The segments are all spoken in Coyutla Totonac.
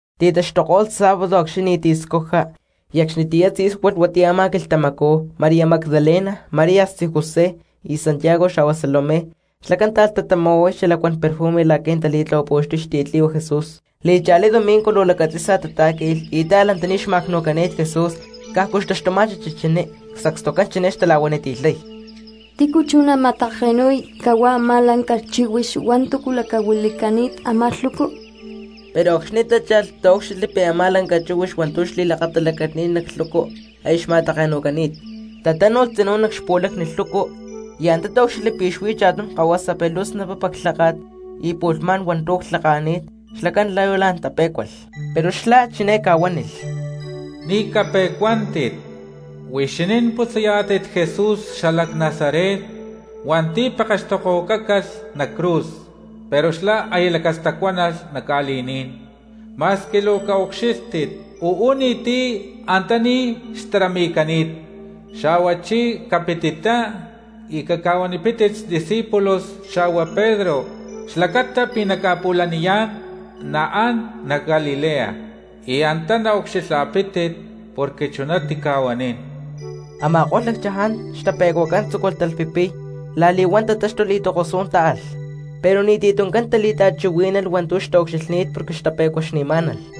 Ti̠taxtuko̠lh sábado acxni̠ ni̠ti̠ cscuja, y acxni̠ tzí̠sualh huatiyá a̠má quilhtamacú, María Magdalena, María xtzí José y Santiago, xa̠hua Salomé, xlacán táalh tatama̠huay xalacuán perfumes la̠qui̠ nataán tali̠tlahuapu̠xtuy xtiyatli̠hua Jesús. Li̠cha̠lí domingo luu lacatzi̠sa tatá̠qui̠lh y táalh antaní xma̠cnu̠cani̠t Jesús cajcu xtaxtuma̠chi chichiní. Sacstucán chiné xtala̠huaniti̠lhay: —¿Tícu chú nama̠take̠nu̠y cahuá a̠má lanca chíhuix hua̠ntu̠ lacahuili̠cani̠t a̠má lhucu? Pero acxni̠ tácha̠lh taúcxilhli pi̠ ta̠má lanca chíhuix hua̠ntu̠ xli̠lakatalacani̠t nac lhucu aya xma̠take̠nu̠cani̠t. Tatánu̠lh tzinú nac xpu̠lacni lhucu y antá taúcxilhli pi̠ xuí cha̠tum kahuasa, pero luu snapapa xlháka̠t y pu̠lhmá̠n hua̠ntu̠ clhaka̠ni̠t, xlacán luu la̠n tape̠cualh. Pero xlá chiné ca̠huánilh: —Ni̠ cape̠cuántit. Huixinín putzayá̠tit Jesús xalac Nazaret hua̠nti̠ pekextokohuacácalh nac cruz. Pero xlá aya lacastacuánalh nac ca̠li̠ní̠n. Ma̠squi luu caucxílhtit uú ni̠ti̠ antaní xtarami̠cani̠t. Xa̠huachí capitittá y caca̠huanipítit xdiscípulos xa̠hua Pedro xlacata pi̠ naca̠pu̠laniyá̠n naán a̠má nac Galilea y antá naucxilha̠pítit porque chuná tica̠huanín. Ama̠ko̠lh lacchaján xtape̠cuacán tzúculh talhpipiy; la̠li̠huán tatáxtulh y tokosú̠n táalh. Pero ni̠ti̠ tuncán tali̠ta̠chuhuí̠nalh hua̠ntu̠ xtaucxilhni̠t porque xtape̠cuaxni̠má̠nalh.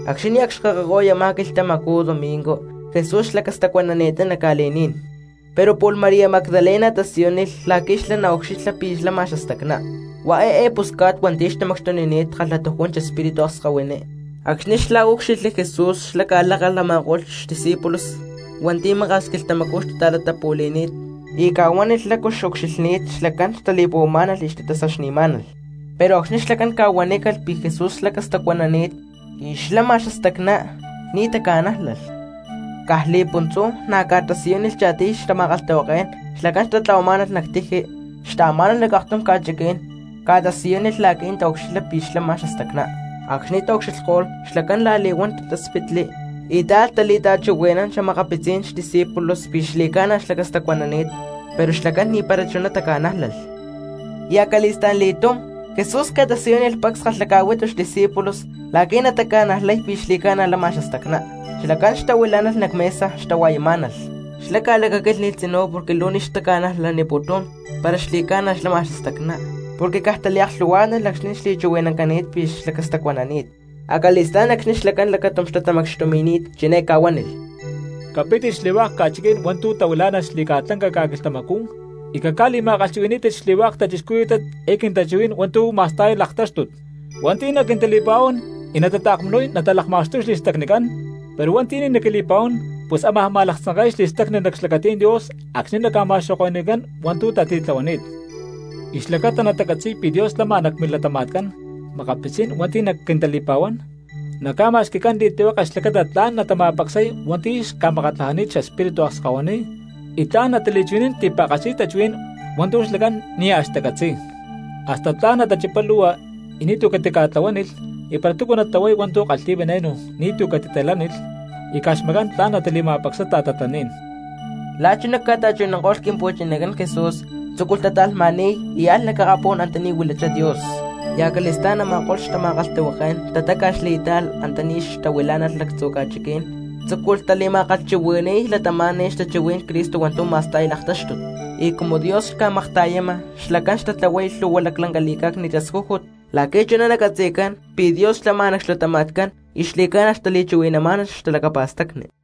Acxni̠ nia̠ cxkakako̠y a̠má quilhtamacú domingo Jesús xlacastacuanani̠ttá nac ca̠li̠ní̠n; pero pu̠lh María Magdalena tasiyúnilh la̠qui̠ xlá naucxilha pi̠ lama xastacná. Huá eé pusca̠t hua̠nti̠ xtamacxtunini̠t kalhatujún xespíritu akskahuiní. Acxni̠ xlá úcxilhli Jesús xlá ca̠lákalh a̠ma̠ko̠lh xcompañeros Jesús hua̠nti̠ maka̠s quilhtamacú xtata̠latapu̠li̠ni̠t y ca̠huánilh lácu xucxilhni̠t, xlacán xtali̠puhuamá̠nalh y xtatasaxni̠má̠nalh. Pero acxni̠ xlacán ca̠huanícalh pi̠ Jesús xlacastacuanani̠t y xlama xastacná, ni̠ taca̠nájlalh. Caj li̠puntzú na̠ ca̠tasiyúnilh cha̠tiyli̠tum xtama̠kalhtahuaké̠n xlacán xtayá̠nalh nac tiji xtaamá̠nalh nac aktum ca̠chiquí̠n; ca̠tasiyúnilh la̠qui̠ nataucxilha pi̠ xlama xastacná. Acxni̠ taucxilhko̠lh, xlacán la̠li̠huán tatáspitli y táalh tali̠ta̠chuhui̠nán xa̠makapitzí̠n discípulos pi̠ xli̠ca̠na xlacastacuanani̠t. Pero xlacán ni̠para chuná taca̠nájlalh. Y acali̠sta̠n li̠túm Jesús ca̠tasiyúnilh pacs kalhaca̠huitu xdiscípulos la̠qui̠ nataca̠najlay pi̠ xli̠ca̠na lama xastacná. Xlacán xtahuilá̠nalh nac mesa xtahua̠yamá̠nalh; xlá ca̠lacaquílhni̠lh tzinú porque luu ni̠ xtaca̠najlaputún para xli̠ca̠na xlama xastacná, porque caj taliaklhu̠huá̠tnalh acxni̠ xli̠chuhui̠nancani̠t pi̠ xlacastacuanani̠t. Acali̠stá̠n acxni̠ xlacán lacatum xtatamacxtumi̠ni̠t chiné ca̠huánilh: —Capítit xli̠hua̠k ca̠chiquí̠n hua̠ntu̠ tahuilá̠nalh xli̠ca̠lanca ca̠quilhtamacú y caca̠li̠ma̠kalhchuhui̠ní̠tit xli̠hua̠k cristianos eé quintachuhuí̠n hua̠ntu̠ ma̠sta̠y laktáxtut. Hua̠nti̠ naquintali̠pa̠huán y natataakmunuy natalakma̠xtuy xli̠stacnicán, pero hua̠nti̠ ni̠ naquili̠pa̠huán pus ámaj ma̠laktzanke̠y xli̠stacni nac xlacatí̠n Dios acxni̠ naca̠ma̠xoko̠ni̠cán hua̠ntu̠ tatitlahuani̠t. Y xlacáta natacatzi̠y pi̠ Dios lama nac milatama̠tcán makapitzí̠n hua̠nti̠ naquintali̠pa̠huán naca̠ma̠xqui̠cán li̠tlihueke xlacata tla̠n natama̠pacsay hua̠nti̠ ca̠makatlajani̠t xespíritu akskahuiní y tla̠n natali̠chuhui̠nán ti̠pa̠katzi tachuhuí̠n hua̠ntu̠ xlacán nia̠ xtacatzi̠y. Hasta tla̠n natachipay lu̠hua y ni̠tu̠ catica̠tlahuánilh, y para túcu natahuay hua̠ntu̠ kalhi̠y veneno ni̠tu̠ catitali̠lánilh, y caj xmacán tla̠n natali̠ma̠pacsay ta̠tatlaní̠n. La̠ chuná ca̠ta̠chuhui̠nanko̠lh Quimpu̠chinacán Jesús tzúculh tata̠lhma̠ni̠y y alh nac akapú̠n antaní huilachá Dios. Y acali̠stá̠n a̠ma̠ko̠lh xtama̠kalhtahuaké̠n tatáca̠xli y táalh antaní tahuilá̠nalh lactzu̠ ca̠chiquí̠n, tzúculh tama̠kalhchuhui̠ni̠y cristianos xtachuhuí̠n Cristo hua̠ntu̠ ma̠sta̠y laktáxtut. Y cumu Dios xca̠makta̠yama xlacán xtatlahuay lhu̠hua laclanca li̠cá̠cni̠t tascújut la̠qui̠ chuná nacatzi̠cán pi̠ Dios xlama nac xlatama̠tcán y xli̠ca̠na xtali̠chuhui̠namá̠nalh xtalacapa̠stacni.